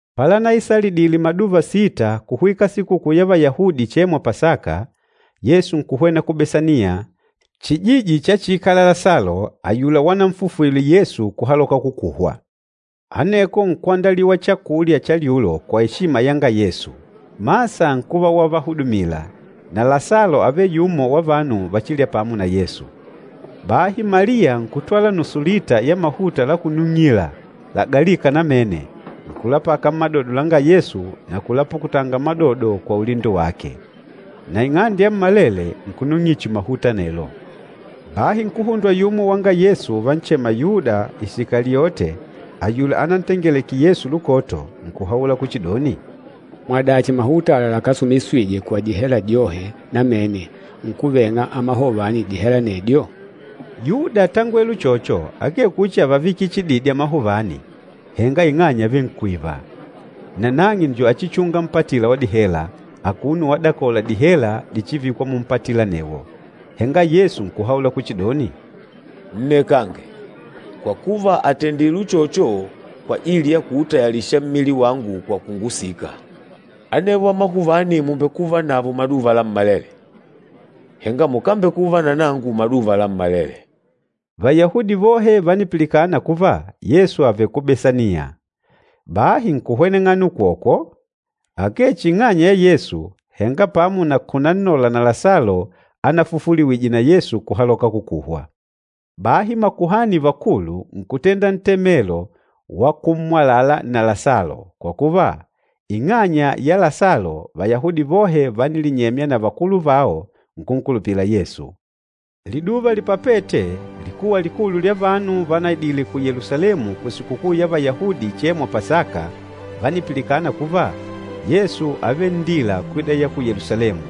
Palanaisalidile maduva sita kuhwika Sikukuu ya Vayahudi ichêmwa Pasaka, Yesu nkuhwena ku Besaniya, chijiji chachiikala Lasalo, ayula wananfufwile Yesu kuhaloka kukuhwa. Aneko nkwandaliwa chakulya cha lyulo kwa eshima yanga Yesu. Masa nkuva wavahudumila, na Lasalo ávele yumo wa vanu vachîlya pamo na Yesu. Bahi Maliya nkutwala nusu lita ya mahuta lakunung'ila, lagalîka namene, nkulapaka mmadodo langa Yesu na kulapukutanga madodo kwa ulindo wake. Na ing'ande yammalele nkunung'ila chihi mahuta anelo. Bahi nkuhundwa yumo wanga Yesu uvanchema Yuda Isikaliote, ayula anantengeleke Yesu lukoto, nkuhaula kuchidoni, “Mwadachi mahuta ala lakásumisijwe kwa dihela dyohe namene, nkuveng'a amahuvani dihela anedyo?” Yuda átangwele uchocho akee kuchi ávavikila chididi amahuvani, henga ing'anya ávele nkwiva. Na nang'e njo achichunga mpatila wa dihela, akuno wadakola dihela dichivikwa mumpatila anewo. Henga Yesu nkuhaula kuchidoni, “Nnekange, kwa kuva àtendile uchocho kwajili ya kuutayalisha mmili wangu kwa kungusika. Anevo amahuvani mùmbekuvanavo maduva lammalele, henga mukámbekuva na nangu maduva lammalele.” Vayahudi vohe vánipilikana kuva Yesu ávele ku Besaniya. Bahi nkuhweneng'ana ukwokwo, akee chihi ing'anya ya Yesu, henga pamo na kunannola na Lasalo anafufuliwije na Yesu kuhaloka kukuhwa. Bahi makuhani vakulu nkutenda ntemelo wa kummwalala na Lasalo, kwa kuva, ing'anya ya Lasalo, Vayahudi vohe vánilinyemya na vakulu vao, nkunkulupila Yesu. Liduva lipapete, likuwa likulu lya vanu vanaidile ku Yelusalemu kusikukuu ya Vayahudi ichêmwa Pasaka vánipilikana kuva, Yesu ávele nndila kwida ya ku Yelusalemu.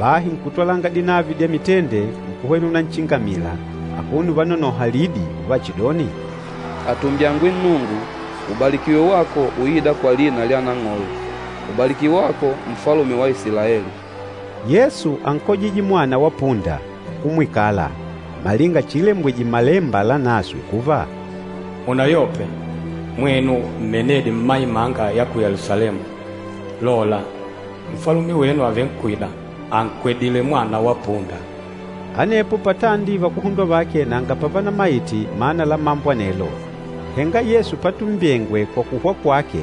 Bahi nkutwalanga dinavi dya mitende, nkuhwena unanchingamila, akuno uvanonoha lidi uvachidoni, “Atumbyangwe Nnungu! Ubalikiwe wako uîda kwa lina lya Nang'olo! Ubalikiwe wako Nfalume wa Isilaeli!” Yesu ánkojije mwana wa punda, nkumwikala, malinga chiilembwije Mmalemba Lanaswe kuva, “Munayope, mwenu mmenedi mma imanga ya ku Yelusalemu! Lola, Nfalume wenu àvenkwida, ànkwedile mwana wa punda.” Anepo patandi vakuhundwa vake nanga pavanamaite mana la mambo anelo, henga Yesu patumbyengwe kwa kuhwa kwake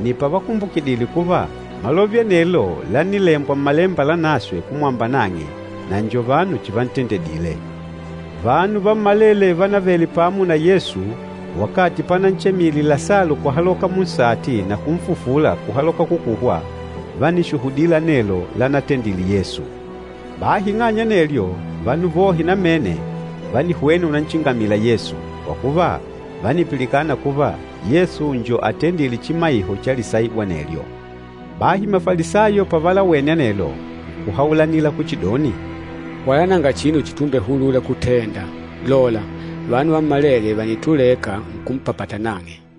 nni pavakumbukidile kuva malove anelo lánilembwa Mmalemba Lanaswe kumwamba nang'e, na njo vanu chivantendedile. Vanu vammalele vánavele pamo na Yesu wakati pananchemile Lasalo kuhaloka munsati na kunfufula kuhaloka kukuhwa, vánishuhudila anelo lanatendile Yesu. Bahi ing'anya ya anelyo, vanu vohe namene vánihwena unanchingamila Yesu, kwa kuva vánipilikana kuva Yesu njo atendîle chimaiho cha lisaibu anelyo. Bahi Mafalisayo pavalawene anelo, nkuhaulanila kuchidoni, “Wala nanga chinu chitumbehulula kutenda. Lola, vanu vammalele vànituleka nkumpapata nang'e.”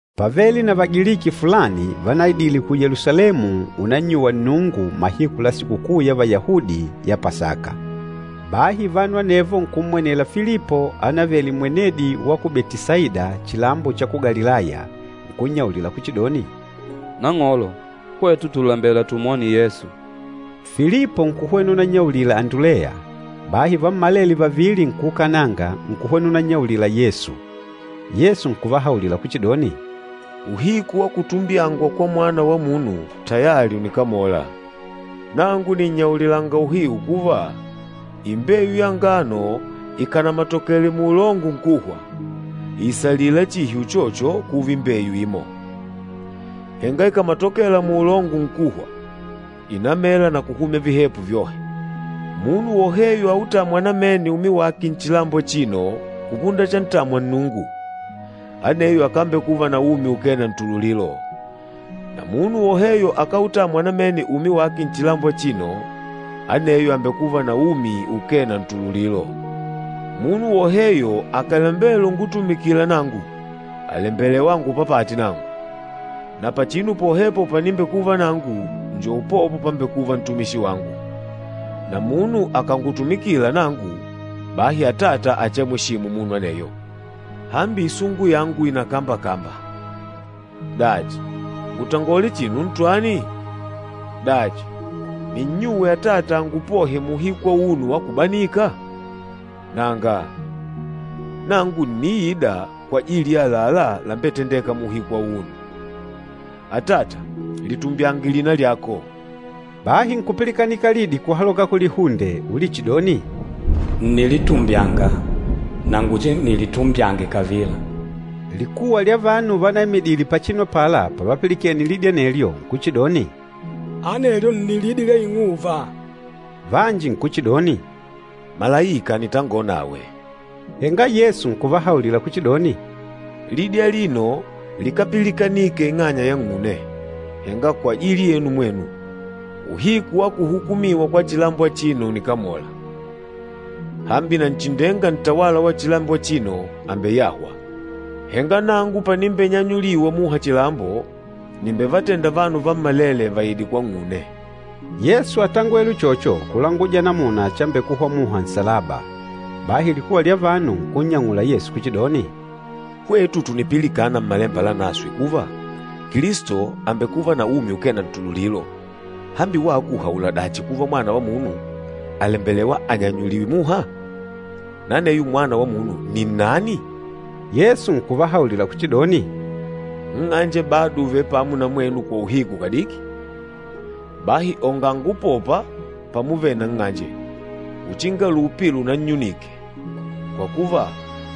Pávele na Vagiliki fulani vanaidile ku Yelusalemu unnannyuwa Nnungu mahiku la Sikukuu ya Vayahudi ya Pasaka. Bahi vanu anevo nkummwenela Filipo ánavele mwenedi wa ku Betisaida chilambo cha ku Galilaya, nkunnyaulila kuchidoni, “Nang'olo, hwetu tùlembela tumwone Yesu.” Filipo nkuhwena unannyaulila Anduleya, bahi vammalele vavili nkuukananga nkuhwena unannyaulila Yesu. Yesu nkuvahaulila kuchidoni, “Uhiku wa kutumbyangwa kwa Mwana wa Munu tayali ùnikamola. Nangu nìnnyaulilanga uhiu kuva, imbeyu ya ngano ikànamatokele muulongo nkuhwa, ìisalila chihi uchocho kuva imbeyu imo. Henga ikàmatokela muulongo nkuhwa, ìnamela na kuhumya vihepo vyohe. Munu woheyo autâmwa namene umi wake nchilambo achino kupunda chantamwa Nnungu, aneyo akambekuva na umi ukee na ntululilo, na munu woheyo akáutamwa namene umi wake nchilambo achino, aneyo àmbekuva na umi ukee na ntululilo. Munu woheyo akàlembela ungutumikila nangu àlembelewa angupapate nangu, na pachinu pohepo panimbekuva nangu njo upopo pambekûva ntumishi wangu. Na munu akàngutumikila nangu, bahi Atata achiamweshimu munu aneyo. Hambi isungu yangu ìnakambakamba. Dachi, ngutangole chinu ntwani? Dachi, ninnyuwe Atata angupohe muuhiku auno wa kubanika? Nanga, nangu ǹniida kwajili ya àlalá lambetendêka muuhiku auno. Atata, litumbyange lina lyako!” Bahi nkupilikanika lidi kuhaloka kulihunde ulichidoni, “Ǹnilitumbyanga, na nguchinilitumbyange kavila.” Likuwa lya vanu vanaimidile pachinu apala pavapilikene lidi anelyo nkuchidoni, “Anelyo nni lidi lya ing'uva!” Vanji nkuchidoni, “Malaika ànitangonawe!” Henga Yesu nkuvahaulila kuchidoni, “Lidi alino likápilikanike ing'anya yang'une, henga kwajili yenu mwenu. Uhiku wa kuhukumiwa kwa chilambo achino ùnikamola. Hambi Nanchindenga ntawala wa chilambo achino àmbeyahwa. Henga nangu panimbenyanyuliwa muha chilambo, nìmbevatenda vanu vammalele vaide kwang'une.” Yesu átangwele uchocho kulanguja namuna chambekuhwa muha nsalaba. Bahi likuwa lya vanu nkunnyang'ula Yesu kuchidoni, “Hwetu tùnipilikana Mmalemba Lanaswe kuva, Kilisto àmbekuva na umi ukee na ntululilo. Hambi wako ùhaula dachi kuva Mwana wa Munu àlembelewa anyanyuliwe muha? Na aneyo Mwana wa Munu ni nnani?” Yesu nkuvahaulila kuchidoni, “Nng'anje bado ùvele pamo na mwenu kwa uhiku kadiki. Bahi onganga upopa pamuvele na nng'anje, uchinga lupi lunannyunike, kwa kuva,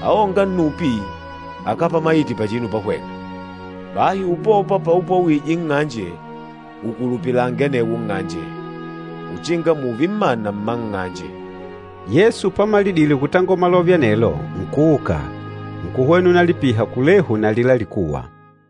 aônga nnupi akápamaite pachinu pahwena. Bahi upopa paupwawije nng'anje, ukulupilange anewo nng'anje, uchinga mùùve mmana mma nng'anje.” Yesu pamalidile kutangola malove anelo, nkuuka, nkuhwena unalipiha kulehu na alila likuwa.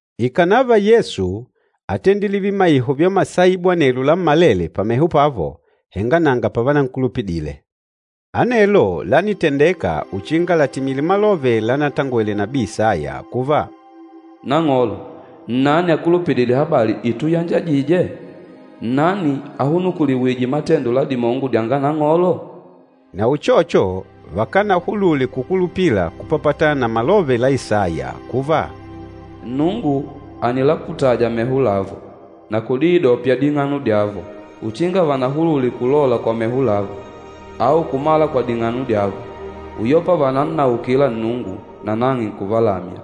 Ikànava Yesu átendile vimaiho vya masaibu anelo lammalele pameho pavo, henga nanga pavanankulupidile. Anelo lánitendeka uchinga latimile malove lanatangwele nabii Isaya kuva, “Nang'olo, nnani akulupidîle habali ituyanjajije? Nnani ahunukuliwîje matendo la dimongo dyanga Nang'olo?” Na uchocho, vakanahulule kukulupila kupapatana na malove la Isaya kuva, “Nnungu ànilaputaja meho lavo, na kudiidyopya ding'ano dyavo, uchinga vanahulule kulola kwa meho lavo, au kumala kwa ding'ano dyavo, uyopa vànannaukila Nnungu, nanang'e nkuvalamya.”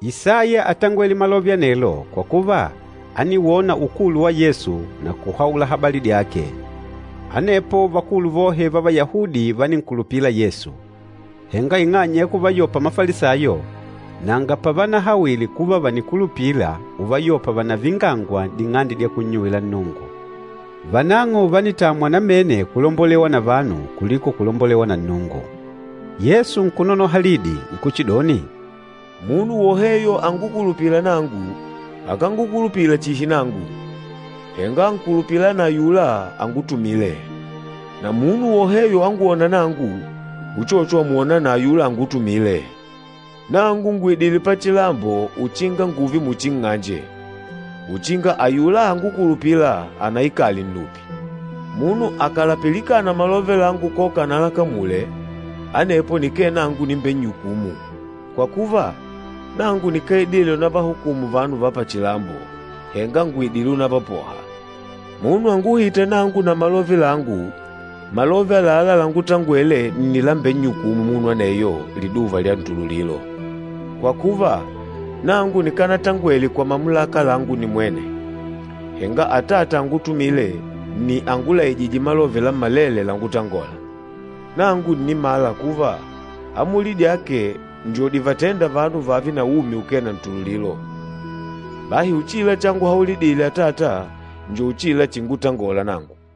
Isaya átangwele malove anelo kwa kuva ániwona ukulu wa Yesu na kuhaula habali dyake. Anepo vakulu vohe va Vayahudi váninkulupila Yesu. Henga ing'anya ya kuvayopa Mafalisayo, nanga pavanahawile kuva vànikulupila uvayopa vànavingangwa n'ding'ande dya kunnyuwila Nnungu. Vanang'o vánitamwa namene kulombolewa na vanu kuliko kulombolewa na Nnungu. Yesu nkunonoha lidi nkuchidoni, “Munu woheyo angukulupîla nangu, akángukulupila chihi nangu, henga ànkulupila na ayula angutumîle. Na munu woheyo angwôna nangu, uchocho àmwona na ayula angutumîle. Nangu ngùidile pachilambo uchinga ngùùve muchi nng'anje, uchinga ayula angukulupîla anaikale nnupi. Munu akàlapilikana malove langu koka analakamule, anepo nike nangu nimbennyukûmu. Kwa kuva, nangu nikáidile unavahukumu vanu va pachilambo, henga ngùidile unavapoha. Munu anguhîta nangu na malove langu, malove àlalá langutangwele nni lambennyukûmu munu aneyo liduva lya ntululilo. Kwa kuva, nangu nikanatangwele kwa mamulaka langu nimwene, henga Atata angutumîle nni angulaijîje malove lammalele langutangola. Nangu ǹnimala kuva, amuli dyake njo divatênda vanu vààve na umi ukee na ntululilo. Bahi uchila changuhaulidile Atata njo uchila chingutangola nangu.”